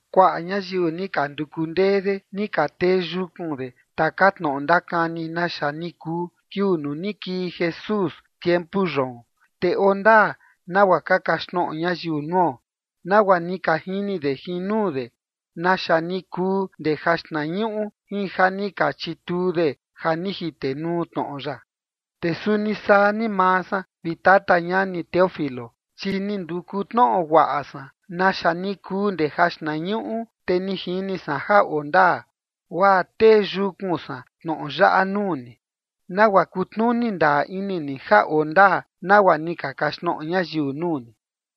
Kuaꞌa ñayiu ni ka nduku ndee de ni ka tee yukun de taka tnoꞌo ndakani naxa ni kuu kiuu nuu ni kii Jesús tiempu yoon. Te oo ndaa nagua ka kaxtnoꞌo ñayiu nuo, nagua ni ka jini de jin nuu de naxa ni kuu ndee jaxtnañuꞌu, jin ja ni ka chituu de ja ni jitenuu tnoꞌo ya. Te suni saa ni maa san, vi Tata ñani Teófilo, chi ni nduku tnoꞌo guaꞌa san naxa ni kuu ndee jaxtnañuꞌu, te ni jini san ja oo ndaa, guaa tee yukun san tnoꞌo yaꞌa nuu ni, nagua kutnuni ndaa ini ni ja oo ndaa nagua ni ka kaxtnoꞌo ñayiu nuu ni.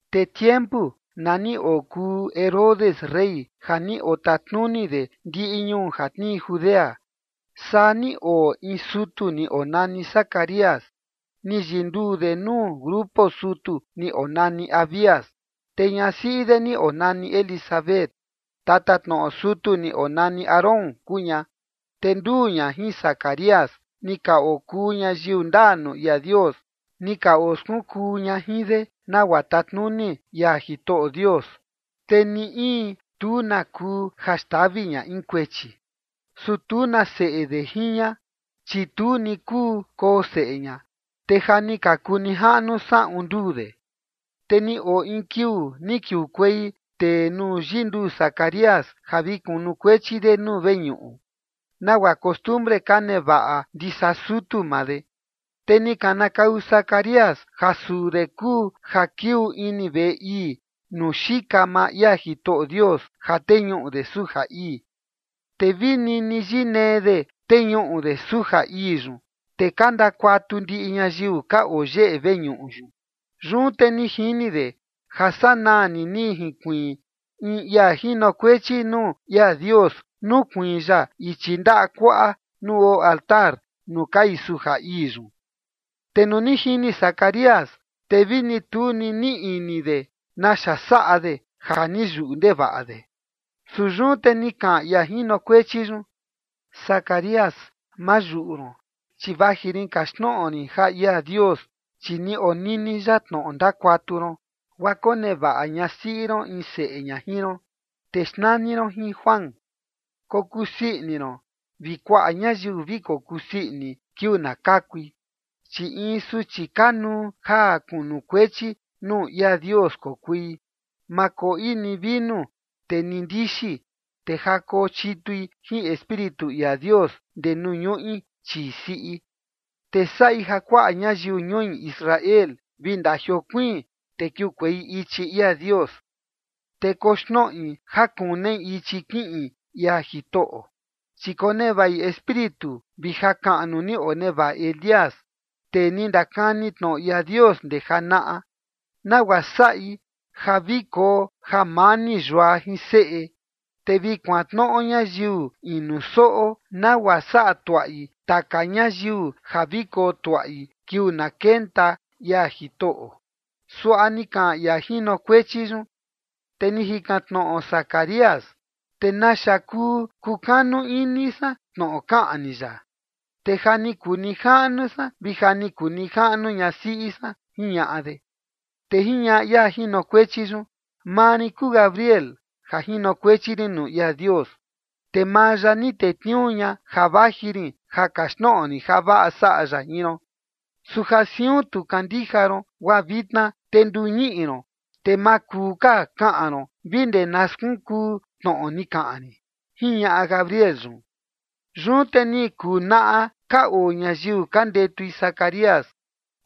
Te tiempu na ni okuu Herodes rey ja ni otatnuni de ndiꞌi ñuu ja tnii Judea, saa ni oo in sutu ni onani Zacarías. Ni yinduu de nuu grupo sutu ni onani Abías. Te ñasiꞌi de ni onani Elisabet, tatatnoꞌo sutu ni onani Aarón kuu ña. Te nduu ña jin Zacarías ni ka okuu ñayiu ndaa nuu ia Dios, ni ka oskunkuu ña jin de nagua tatnuni ia Jitoꞌo Dios, te ni in tu na kuu ja xtavi ña in kuechi. Su tu na seꞌe de jin ña, chi tu ni kuu koo seꞌe ña, te ja ni ka kuu nijaꞌnu saꞌun nduu de. Te ni oo in kiuu ni kiukuei tee nuu yinduu Zacarías ja vi kunukuechi de nuu veñuꞌu, nagua costumbre ka nevaꞌa ndisa sutu maa de. Te ni kanakau Zacarías ja suu de kuu ja kiuu ini veꞌe ii nuu xika maa ia Jitoꞌo Dios ja teñuꞌu de suja ii. Te vi nini yinee de teñuꞌu de suja ii yun, te ka ndakuatu ndiꞌi ñayiu ka oo yeꞌe veñuꞌu yun. Yun te ni jini de ja sanaa ni jinkuiin in ia jinokuechi nuu ia Dios nukuiin ya ichi ndaꞌa kuaꞌa nuu oo altar nuu kai suja ii yun. Te nuu ni jini Zacarías, te vi tu ni niꞌi ini de naxa saꞌa de ja ni yuꞌu ndevaꞌa de. Su yun te ni kaꞌan ia jinokuechi yun: ―Zacarías, ma yuꞌu ron, chi vaji rin kaxtnoꞌo rin ja ia Dios, chi ni onini ya tnoꞌo ndakuatu ron, guaa konevaꞌa ñasiꞌi ron in seꞌe ña jin ron, te xnani ron jin Juan. Kokusii ini ron vi kuaꞌa ñayiu vi kokusii ini kiuu na kakui, chi in suchi kanuu ja kunukuechi nuu ia Dios kokui. Ma koꞌi ni vinu te ni ndixi, te ja kochitui jin Espíritu ia Dios ndee nuu ñuꞌi chii siꞌi. Te saꞌi ja kuaꞌa ñayiu ñui Israel vi ndajiokuiin te kiukuei ichi ia Dios. Te koxnoꞌi ja kunei ichi kiꞌin ia Jitoꞌo, chi konevaꞌi Espíritu vi jakaꞌnu ni onevaꞌa Elías, tee ni ndakani tnoꞌo ia Dios ndee janaꞌa, nagua saꞌi ja vi koo jamani yua jin seꞌe, te vi kuantnoꞌo ñayiu inu soꞌo, nagua saꞌa tuaꞌi taka ñayiu ja vi kotuaꞌi kiuu na kenta ia Jitoꞌo ―suaꞌa ni kaꞌan ia jinokuechi yun. Te ni jikan tnoꞌo Zacarías: ―¿Te naxa kuu kukanu ini san tnoꞌo kaꞌan ni yaꞌa? Te ja ni kuu nijaꞌnu san vi ja ni kuu nijaꞌnu ñasiꞌi san ―jiñaꞌa de. Te jiñaꞌa ia jinokuechi yun: ―Maa rin kuu Gabriel, ja jinokuechi rin nuu ia Dios, te maa ya ni tetniuu ña ja vaji rin ja kaxtnoꞌo rin javaꞌa saꞌa ya jin ron. Su ja siun tu kandija ron, guaa vitna te nduu ñiꞌi ron, te ma kuu ka kaꞌan ron vi ndee na skunkuu tnoꞌo ni kaꞌan rin ―jiñaꞌa Gabriel yun. Yun te ni kuu naꞌa ka oo ñayiu ka ndetui Zacarías,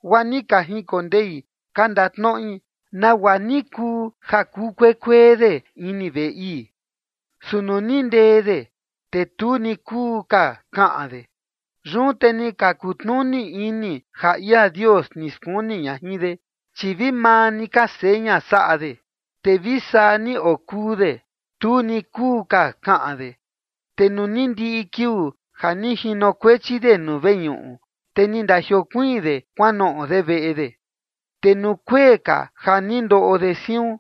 guaa ni ka jinkondei ka ndatnoꞌi nagua ni kuu ja kuu kuekuee de ini veꞌe ii. Su nuu ni ndee de, te tu ni kuu ka kaꞌan de. Yun te ni ka kutnuni ini ja ia Dios ni skuni ña jin de, chi vi maa ni ka seña saꞌa de, te vi saa ni okuu de. Tu ni kuu ka kaꞌan de. Te nuu ni ndiꞌi kiuu ja ni jinokuechi de nuu veñuꞌu, te ni ndajiokuiin de kuanoꞌo de veꞌe de. Te nuu kuee ka ja ni ndoꞌo de siun,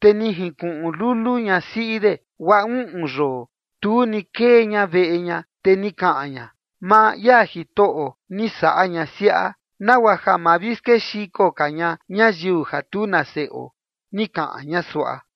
te ni jinkuꞌun lulu ñasiꞌi de, guaa uꞌun yoo tu ni kee ña veꞌe ña. Te ni kaꞌan ña: ―Maa ia Jitoꞌo ni saꞌa ña siaꞌa, nagua ma vi skexiko ka ña ñayiu ja tu na seꞌo ―ni kaꞌan ña suaꞌa.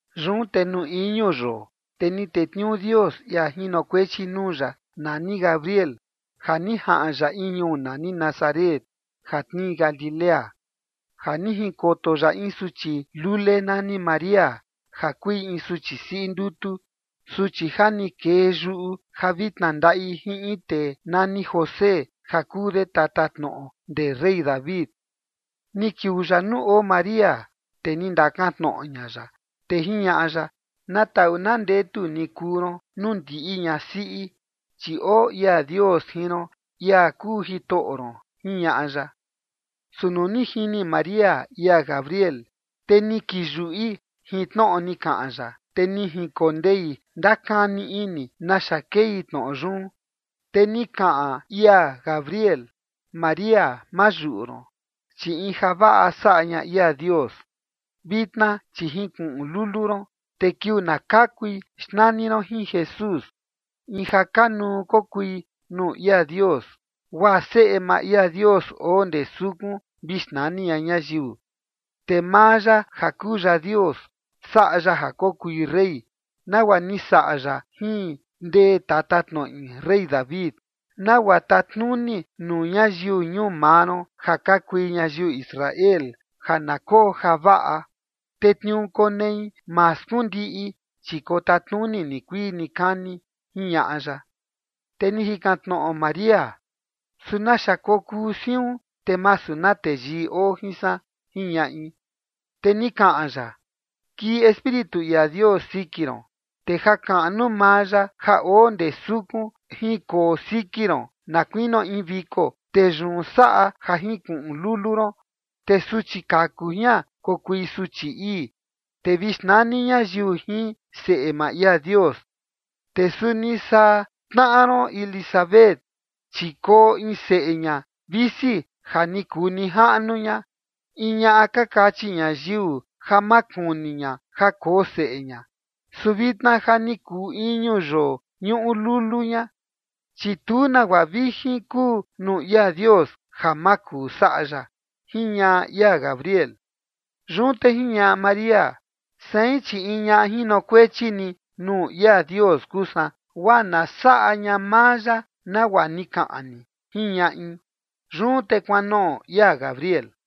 Yun te nuu iñu yoo, te ni tetniuu Dios ia jinokuechi nuu ya nani Gabriel, ja ni jaꞌan ya in ñuu nani Nazaret ja tnii Galilea, ja ni jinkoto ya in suchi lule nani María, ja kui in suchi siꞌi ndutu, suchi ja ni kee yuꞌu ja vi tnandaꞌi jin in tee nani José ja kuu de tatatnoꞌo ndee rey David. Ni kiuu ya nuu oo María, te ni ndakantnoꞌo ña ya, te jiñaꞌa ya: ―Na taꞌu na ndetu ni kuu ron nuu ndiꞌi ñasiꞌi, chi oo ia Dios jin ron, ia kuu Jitoꞌo ron ―jiñaꞌa ya. Su nuu ni jini María ia Gabriel, te ni kiyuꞌi jin tnoꞌo ni kaꞌan ya, te ni jinkondei ndakani ini naxa kei tnoꞌo yun. Te ni kaꞌan ia Gabriel: ―María, ma yuꞌu ron, chi in javaꞌa saꞌa ña ia Dios. Vitna chi jinkuꞌun lulu ron, te kiuu na kakui, xnani ron jin Jesús. In ja kanuu kokui nuu ia Dios, guaa seꞌe maa ia Dios oo ndee sukun vi xnani ña ñayiu. Te maa ya ja kuu ya Dios saꞌa ya ja kokui rey nagua ni saꞌa ya jin ndee tatatnoꞌi rey David, nagua tatnuni nuu ñayiu ñuu maa ron ja ka kui ñayiu Israel ja na koo javaꞌa. Te tniuu konei ma skundiꞌi, chi kotatnuni nikuii nikani ―jiñaꞌa ya. Te ni jikan tnoꞌo María: ―¿Su naxa kokuu siun, te masu na teyii oo jin san? ―jiñaꞌi. Te ni kaꞌan ya: ―Kii Espíritu ia Dios siki ron, te jakaꞌnu maa ya ja oo ndee sukun jinkoo siki ron, na kuinio in viko, te yun saꞌa ja jinkuꞌun lulu ron. Te suchi kaku jian kokui suchi ii, te vi xnani ñayiu jin Seꞌe maa ia Dios. Te suni saa tnaꞌa ron Elisabet, chi koo in seꞌe ña visi ja ni kuu nijaꞌnu ña, in ñaꞌa ka kachi ñayiu ja ma kuni ña ja koo seꞌe ña. Su vitna ja ni kuu iñu yoo ñuꞌu lulu ña. Chi tu nagua vijin kuu nuu ia Dios ja ma kuu saꞌa ya ―jiñaꞌa ia Gabriel. Yun te jiñaꞌa María: ―Sein, chi in ñaꞌa jinokuechi ni nuu ia Dios kuu san, guaa na saꞌa ña maa ya nagua ni kaꞌan ni ―jiñaꞌi. Yun te kuanoꞌo ia Gabriel.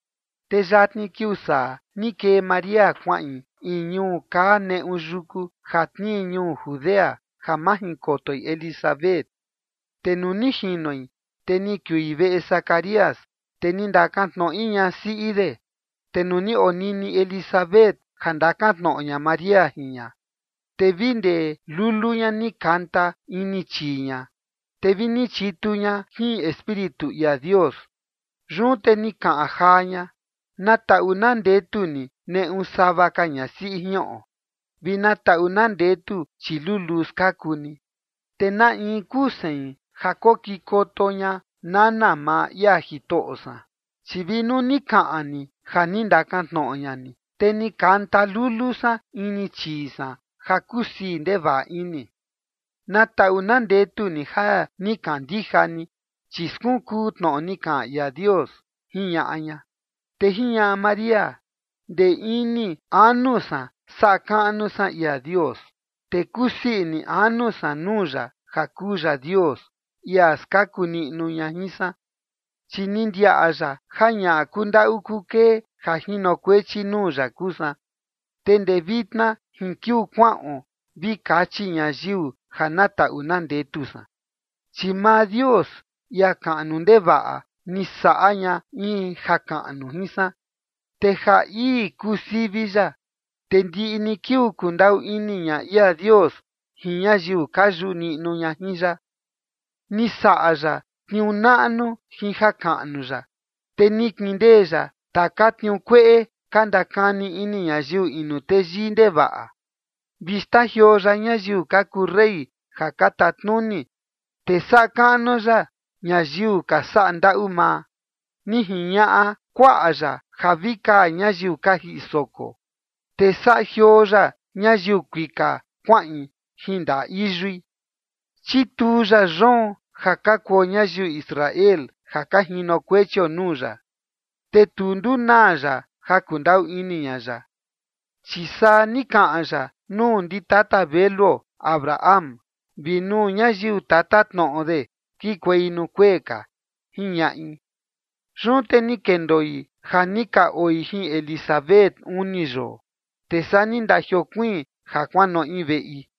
Te yatni kiuu saa ni kee María kuaꞌin in ñuu kaa neꞌu yuku ja tnii ñuu Judea ja majinkotoi Elisabet. Te nuu ni jinoi, te ni kiui veꞌe Zacarías, te ni ndakantnoꞌi ñasiꞌi de. Te nuu ni onini Elisabet ja ndakantnoꞌo ña María jin ña, te vi ndee lulu ña ni kanta ini chii ña, te vi ni chitu ña jin Espíritu ia Dios. Yun te ni kaꞌan jaa ña: ―Na taꞌu na ndetu ni neꞌu sava ka ñasiꞌi jiꞌon, vi na taꞌu na ndetu chiluluu skaku ni. Te ¿na in kuu sein ja kokikoto ña nana maa ia Jitoꞌo san? Chi vi nuu ni kaꞌan ni ja ni ndakantnoꞌo ña ni, te ni kanta lulu san ini chii san ja kusii ndevaꞌa ini. Na taꞌu na ndetu ni ja ni kandija ni, chi skunkuu tnoꞌo ni kaꞌan ia Dios ―jiñaꞌa ña. Te jiñaꞌa María: Ndee ini anu san saꞌa kaꞌnu san ia Dios, te kusii ini anu san nuu ya ja kuu ya Dios, ia skaku niꞌnu ña jin san, chi ni ndiaꞌa ya ja ñaꞌa kundaꞌu kukee ja jinokuechi nuu ya kuu san. Te ndee vitna jin kiuu kuaꞌon vi kachi ñayiu ja na taꞌu na ndetu san, chi maa Dios, ia kaꞌnu ndevaꞌa, ni saꞌa ña in jakaꞌnu jin san, te ja ii kuu sivi ya. Te ndiꞌi ni kiuu kundaꞌu ini ña ia Dios jin ñayiu ka yuꞌu niꞌnu ña jin ya. Ni saꞌa ya tniuu naꞌnu jin jakaꞌnu ya. Te ni kindee ya taka tniuu kueꞌe ka ndakani ini ñayiu inu teyii ndevaꞌa. Vi xtajioo ya ñayiu ka kuu rey ja ka tatnuni, te saꞌa kaꞌnu ya ñayiu ka saꞌa ndaꞌu maa. Ni jiñaꞌa kuaꞌa ya ja vi kaa ñayiu ka jiꞌi soko, te saꞌa jioo ya ñayiu kuika kuaꞌin jin ndaꞌa iyui. Chituu ya yoon ja ka kuo ñayiu Israel ja ka jinokuechio nuu ya, te tu ndunaa ya ja kundaꞌu ini ña ya, chi saa ni kaꞌan ya nuu ndi tata veluo Abraham vi nuu ñayiu tatatnoꞌo de kikuei nuu kuee ka, jiñaꞌi. Yun te ni kendoi ja ni ka oi jin Elisabet uni yoo, te saa ni ndajiokuiin ja kuanoꞌi veꞌi.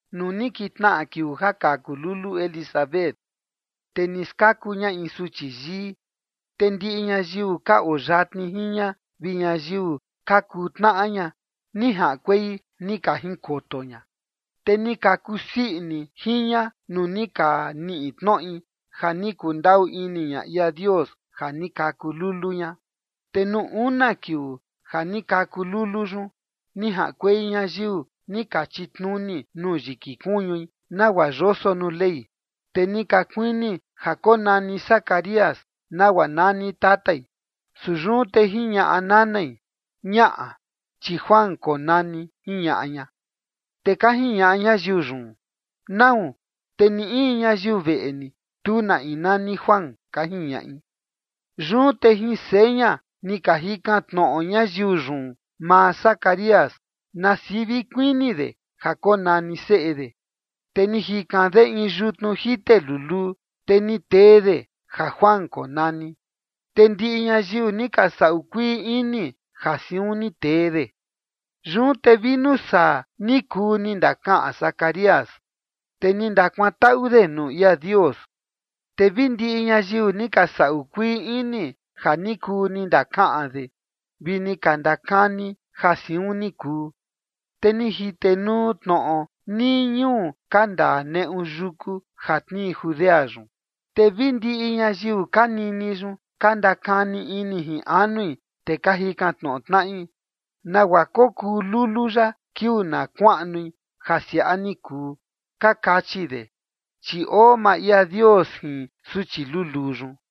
Nuu ni kintnaꞌa kiuu ja kaku lulu Elisabet, te ni skaku ña in suchi yii. Te ndiꞌi ñayiu ka oo yatni jin ña vi ñayiu ka kuu tnaꞌa ña, ni jaꞌankuei ni ka jinkoto ña, te ni ka kusii ini jin ña nuu ni ka niꞌi tnoꞌi ja ni kundaꞌu ini ña ia Dios ja ni kaku lulu ña. Te nuu una kiuu ja ni kaku lulu yun, ni jaꞌankuei ñayiu ni ka chitnuni nuu yiki kuñui nagua yoso nuu Ley. Te ni ka kuini ja konani Zacarías nagua nani tatai. Su yun te jiñaꞌa nanai: ―Ñaꞌa, chi Juan konani ―jiñaꞌa ña. Te ka jiñaꞌa ñayiu yun: ―¿Nau? Te ni in ñayiu veꞌe ni, tu na in nani Juan ―ka jiñaꞌi. Yun te jin seña ni ka jikan tnoꞌo ñayiu yun maa Zacarías na sivi kuini de ja konani seꞌe de. Te ni jikan de in yutnu jite luluu, te ni tee de ja Juan konani. Te ndiꞌi ñayiu ni ka saꞌu kuii ini ja siun ni tee de. Yun te vi nuu saa ni kuu ni ndakaꞌan Zacarías, te ni ndakuantaꞌu de nuu ia Dios. Te vi ndiꞌi ñayiu ni ka saꞌu kuii ini ja ni kuu ni ndakaꞌan de vi ni ka ndakani ja siun ni kuu. Te ni jitenuu tnoꞌo nii ñuu ka ndaa neꞌu yuku ja tnii Judea yun. Te vi ndiꞌi ñayiu ka nini yun ka ndakani ini jin anui, te ka jikan tnoꞌo tnaꞌi: ―¿Nagua kokuu lulu yaꞌa kiuu na kuaꞌnui ja siaꞌa ni kuu? ―ka kachi de. Chi oo maa ia Dios jin suchi luluu yun.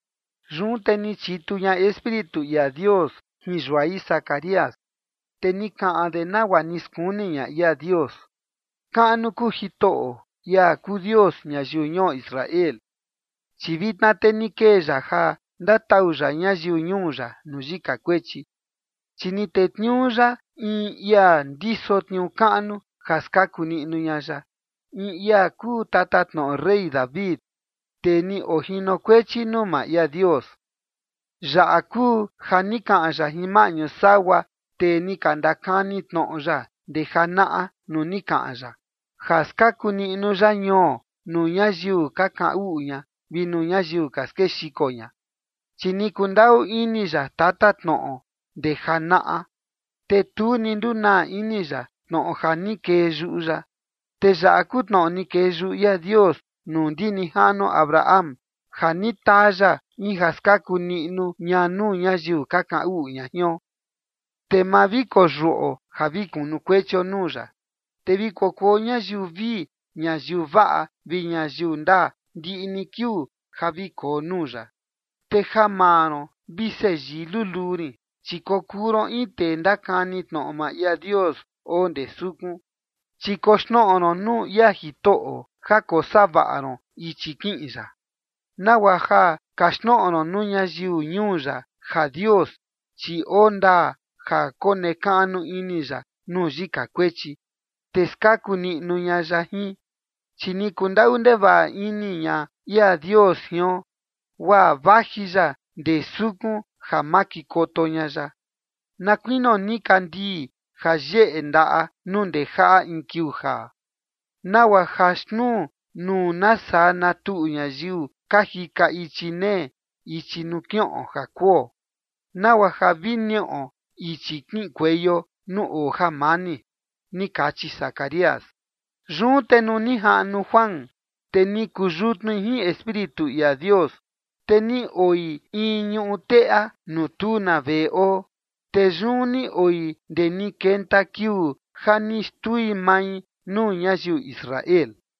Yun te ni chitu ña Espíritu ia Dios jin yuai Zacarías, te ni kaꞌan de nagua ni skuni ña ia Dios: Kaꞌnu kuu Jitoꞌo, ia kuu Dios ñayiu ñuo Israel, chi vitna te ni kee ya ja ndatau ya ñayiu ñuu ya nuu yika kuechi, chi ni tetniuu ya in ia ndiso tniuu kaꞌnu ja skaku niꞌnu ña ya, in ia kuu tatatnoꞌo rey David, tee ni ojinokuechi nuu maa ia Dios. Yaꞌa kuu ja ni kaꞌan ya jin maꞌñu sagua tee ni ka ndakani tnoꞌo ya ndee janaꞌa nuu ni kaꞌan ya ja skaku niꞌnu ya ñuo nuu ñayiu ka kaꞌan uꞌu ña vi nuu ñayiu ka skexiko ña. Chi ni kundaꞌu ini ya tatatnoꞌo ndee janaꞌa, te tu ni ndunaa ini ya tnoꞌo ja ni kee yuꞌu ya. Te yaꞌa kuu tnoꞌo ni kee yuꞌu ia Dios nuu ndi nijaꞌnuo Abraham, ja ni taa ya in ja skaku niꞌnu ña nuu ñayiu ka kaꞌan uꞌu ña jion, te ma vi koyuꞌo ja vi kunukuechio nuu ya. Te vi kokuo ñayiu vii ñayiu vaꞌa vi ñayiu ndaa ndiꞌi ni kiuu ja vi koo nuu ya. Te ja maa ron, vi seꞌe yii luluu rin, chi kokuu ron in tee ndakani tnoꞌo maa ia Dios oo ndee sukun, chi koxnoꞌo ron nuu ia Jitoꞌo ja kosavaꞌa ron ichi kiꞌin ya, nagua ja kaxtnoꞌo ron nuu ñayiu ñuu ya ja Dios, chi oo ndaa ja konekaꞌnu ini ya nuu yika kuechi, te skaku niꞌnu ña ya jin. Chi ni kundaꞌu ndevaꞌa ini ña ia Dios jion, guaa vaji ya ndee sukun ja makikoto ña ya, na kuinio nikandii ja yeꞌe ndaꞌa nuu ndejaꞌa in kiuu jaa, nagua ja xnuu nuu na saa na tuꞌu ñayiu ka jika ichi nee ichi nuu kiꞌon ja kuo, nagua ja vi niꞌo ichi kiꞌinkueio nuu oo jamani ni kachi Zacarías. Yun te nuu ni jaꞌnu Juan, te ni kuu yutnui jin Espíritu ia Dios. Te ni oi in ñuꞌu teꞌa nuu tu na veꞌe oo. Te yun ni oi ndee ni kenta kiuu ja ni xtui mai nuu ñayiu Israel.